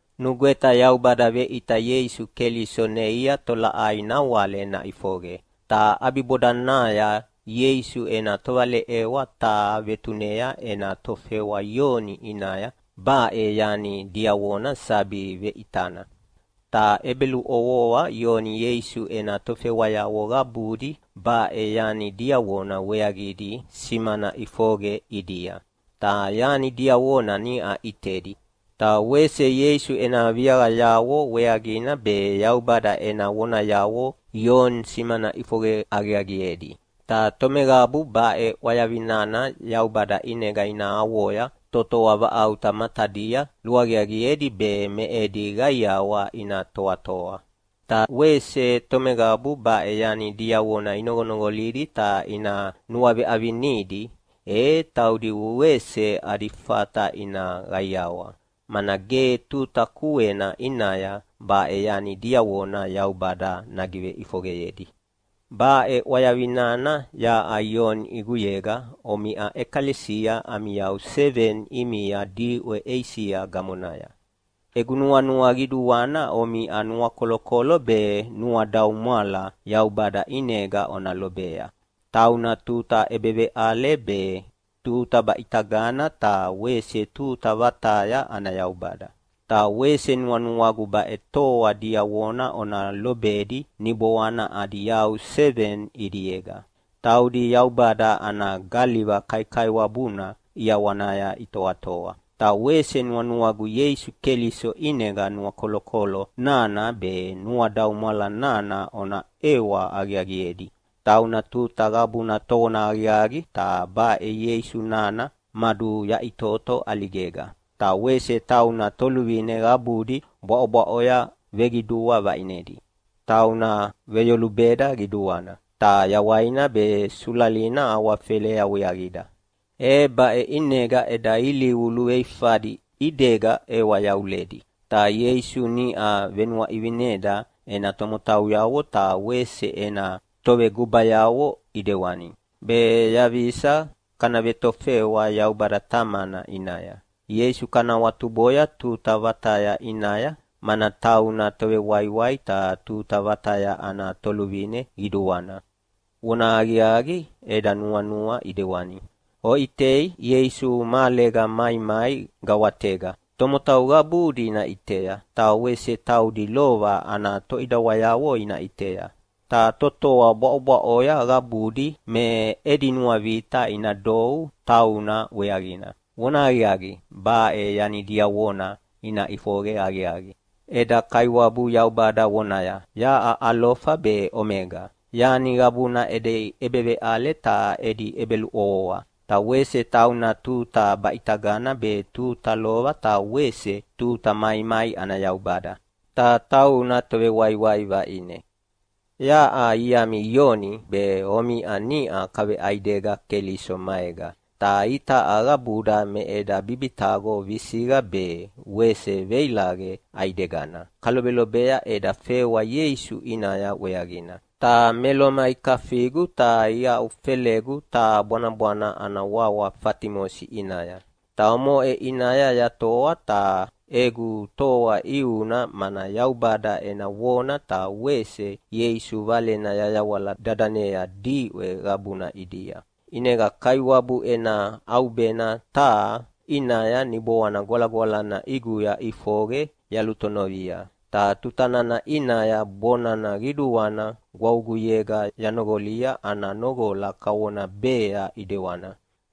Nugweta Yaubada veʼita Ieisu Keliso neia tolaʼai nawale naʼifoqe, ta ʼabibodanaya Ieisu ena tovaleʼewa taha vetunea ena tofewa Ioni ʼinaya baʼe yani diavona sabi veʼitana, ta ʼebeluʼovoa Ioni Ieisu ena tofewayavo qabudi baʼe yani diavona weaqidi simana ʼifoqe ʼidia. Ta yani diavona niʼa ʼitedi, ta wese Ieisu ena viaqayavo weaqina be Yaubada ena vonayavo Ioni simana ʼifoqe aqiaqiedi. Ta tomeqabu baʼe ʼwayavi nana Yaubada ʼinega ina avoya totoa vaʼauta matadia luaqiaqiedi be me edi qaiawa ina toatoa. Ta wese tomeqabu baʼe yani diavona inoqonoqolidi ta ina nuaveʼavinidi, e taudi wese adi fata ina qaiawa, mana ge tuta kuena ʼinaya baʼe yani diavona Yaubada nagiveʼifoqeyedi. Baʼe ʼwayavi nana yaʼa Ioni ʼiguyega omiʼa ʼekalesia ami yau seveni ʼimia diʼwe Eisia gamonaya. Egu nuanua qiduana omiʼa nuakolokolo be nuadaumwala Yaubada ʼinega ona lobea. Tauna tuta ʼebeveʼale be, tuta baʼitagana ta wese tuta vataya ana Yaubada. Ta wese nuanuagu baʼe toa diavona ona lobedi niboana adi yau seveni ʼidiega. Taudi Yaubada ana galiva kaikaiwabuna ʼiawanaya itoatoa. Ta wese nuanuagu Ieisu Keliso ʼinega nuakolokolo nana be nuadaumwala nana ona ʼewa aqiaqiedi. Tauna tuta qabuna tovonahaqiaqi. Ta baʼe Ieisu nana maduyaʼitoto ʼaligega, ta wese tauna toluvine qabudi bwaʼobwaʼoya veqidua vaʼinedi. Tauna veveyolubeda qiduana, ta yawaina be sulalina awafelea weaqida, e baʼe ʼinega eda ilivu luveifadi ʼidega ʼewa yavuledi. Ta Ieisu niʼa venuaʼivineda ena tomotauyavo ta wese ena tovegubayavo ʼidewani, be yaqisa kana vetofewa Yaubada Tamana ʼinaya. Ieisu kana awatuboya tuta vataya ʼinaya, mana tauna Tovewaiwai ta tuta vataya ana Toluvine Qiduana! Vonahaqiaqi, eda nuanua ʼidewani. Oʼitei, Ieisu mahalega maimai gawatega. Tomotau qabudi ina ʼitea, ta wese taudi lova ana toʼidawayavo ina ʼitea. Ta totoa bwaʼobwaʼoya qabudi me edi nuavita ina dou tauna weaqina. Vonahaqiaqi, baʼe yani diavona ina ʼifoqe aqiaqi. Eda Kaiwabu Yaubada vonaya, “Yaʼa Alofa be Omega, yani qabuna edi ʼebeveʼale ta edi ʼebeluʼovoa!” Ta wese tauna tuta baʼitagana be tuta lova ta wese tuta maimai ana Yaubada. Ta tauna Tovewaiwai vaʼine. Yaʼa iami Ioni be omiʼa niʼa kaveʼaidega Keliso maega. Ta itaʼa qabuda me eda bibitaqo visiqa be wese veilaqe ʼaidegana kalobelobea eda fewa Ieisu ʼinaya weaqina. Ta me Loma ikafigu ta iaʼufelegu taha bwanabwana ana wawa Fatimosi ʼinaya, ta omoʼe ʼinaya yatoa. Ta egu toa ʼiuna mana Yaubada ena vona ta wese Ieisu Valena yayawala dadanea diʼwe qabuna ʼidia. ʼInega Kaiwabu ena ʼaubena taha ʼinaya Niboana Gwalagwalana ʼiguya ʼifoqe yalutonovia, ta tutana ʼinaya bona qiduana gwavuguyega yanoqolia ana noqola kavona bea ʼidewana,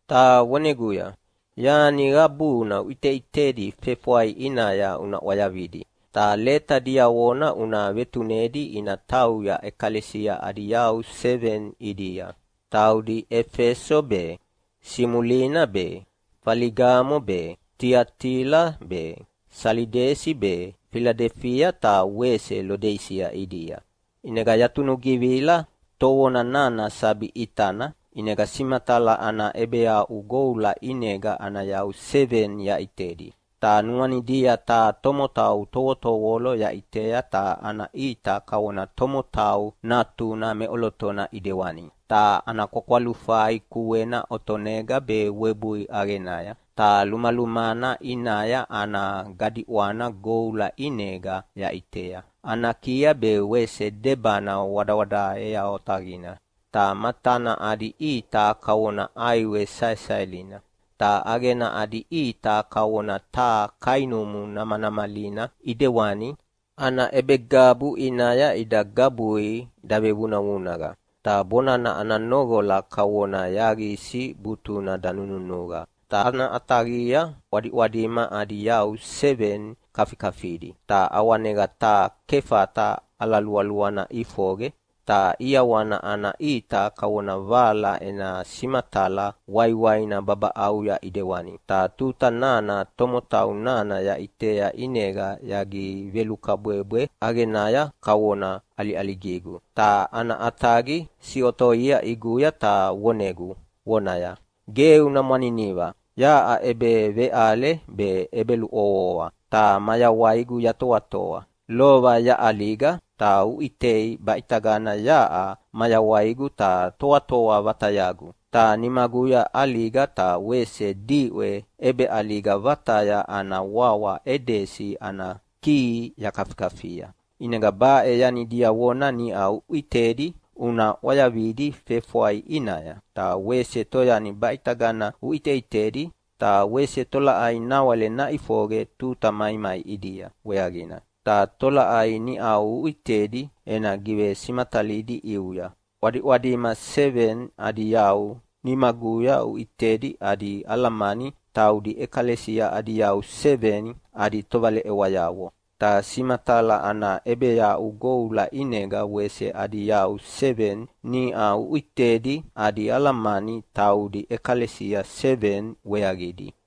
ta voneguya, “Yani qabuna uʼiteʼitedi fefwai ʼinaya una ʼwayavidi, ta leta diavona una vetunedi ina tauya ʼekalesia adi yau seveni ʼidia, taudi Efeso be, Simulina be, Feligamo be, Tiatila be, Salidesi be, Filadelifia ta wese Lodisia ʼidia.” ʼInega yatunugivila tovona nana sabi ʼitana, ʼinega simatala ana ʼebeaʼu goula ʼinega ana yau seveni yaʼitedi. Ta nuanidia taha tomotau tovotovolo yaʼitea ta ana ʼita kavona tomotau natuna meʼolotona ʼidewani. Ta ana kwakwalufai kuena otonega be webui ʼaqenaya, ta lumalumana ʼinaya ana gadiʼwana goula ʼinega yaʼitea. Ana kia be wese debana wadawadaea otaqina, ta matana adi ʼita kavona ʼaiwe saesaelina. Ta ʼaqena adi ʼita kavona taha kainumu namanamalina ʼidewani, ana ʼebegabu ʼinaya ida gabui davevunavunaqa. Ta bonana ana noqola kavona yaqisi butuna danununuqa. Ta ana ʼataqia ʼwadiʼwadima adi yau seveni kafikafidi, ta ʼawanega taha kefata ala lualuana ʼifoqe, ta ʼiawana ana ʼita kavona vala ena simatala waiwaina babaʼauya ʼidewani. Ta tuta nana tomotau nana yaʼitea ʼinega yagivelukabwebwe ʼaqenaya kavona ʼaliʼaligigu. Ta ana ʼataqi siʼotoia ʼiguya ta vonegu vonaya, “Ge una mwaniniva. Yaʼa ʼebeveʼale be ʼebeluʼovoa, ta mayawaigu yatoatoa. Lova yaʼaliga, ta uʼitei baʼitagana yaʼa mayawaigu ta toatoa vatayagu. Ta nimaguya ʼaliga ta wese diʼwe ʼebeʼaliga vataya ana wawa Edesi ana kihi yakafikafia. “ʼInega baʼe yani diavona niʼa uʼitedi una ʼwayavidi fefwai ʼinaya, ta wese toyani baʼitagana uʼiteʼitedi, ta wese tolaʼai nawale naʼifoqe tuta maimai ʼidia weaqina. Ta tolaʼai niʼau uʼitedi ena givesimatalidi ʼiuya. ʼWadiʼwadima seveni adi yau nimaguya uʼitedi adi alamani taudi ʼekalesia adi yau seveni adi tovaleʼewayavo. Ta simatala ana ʼebeaʼu goula ʼinega wese adi yau seveni niʼa uʼitedi adi alamani taudi ʼekalesia seveni weaqidi.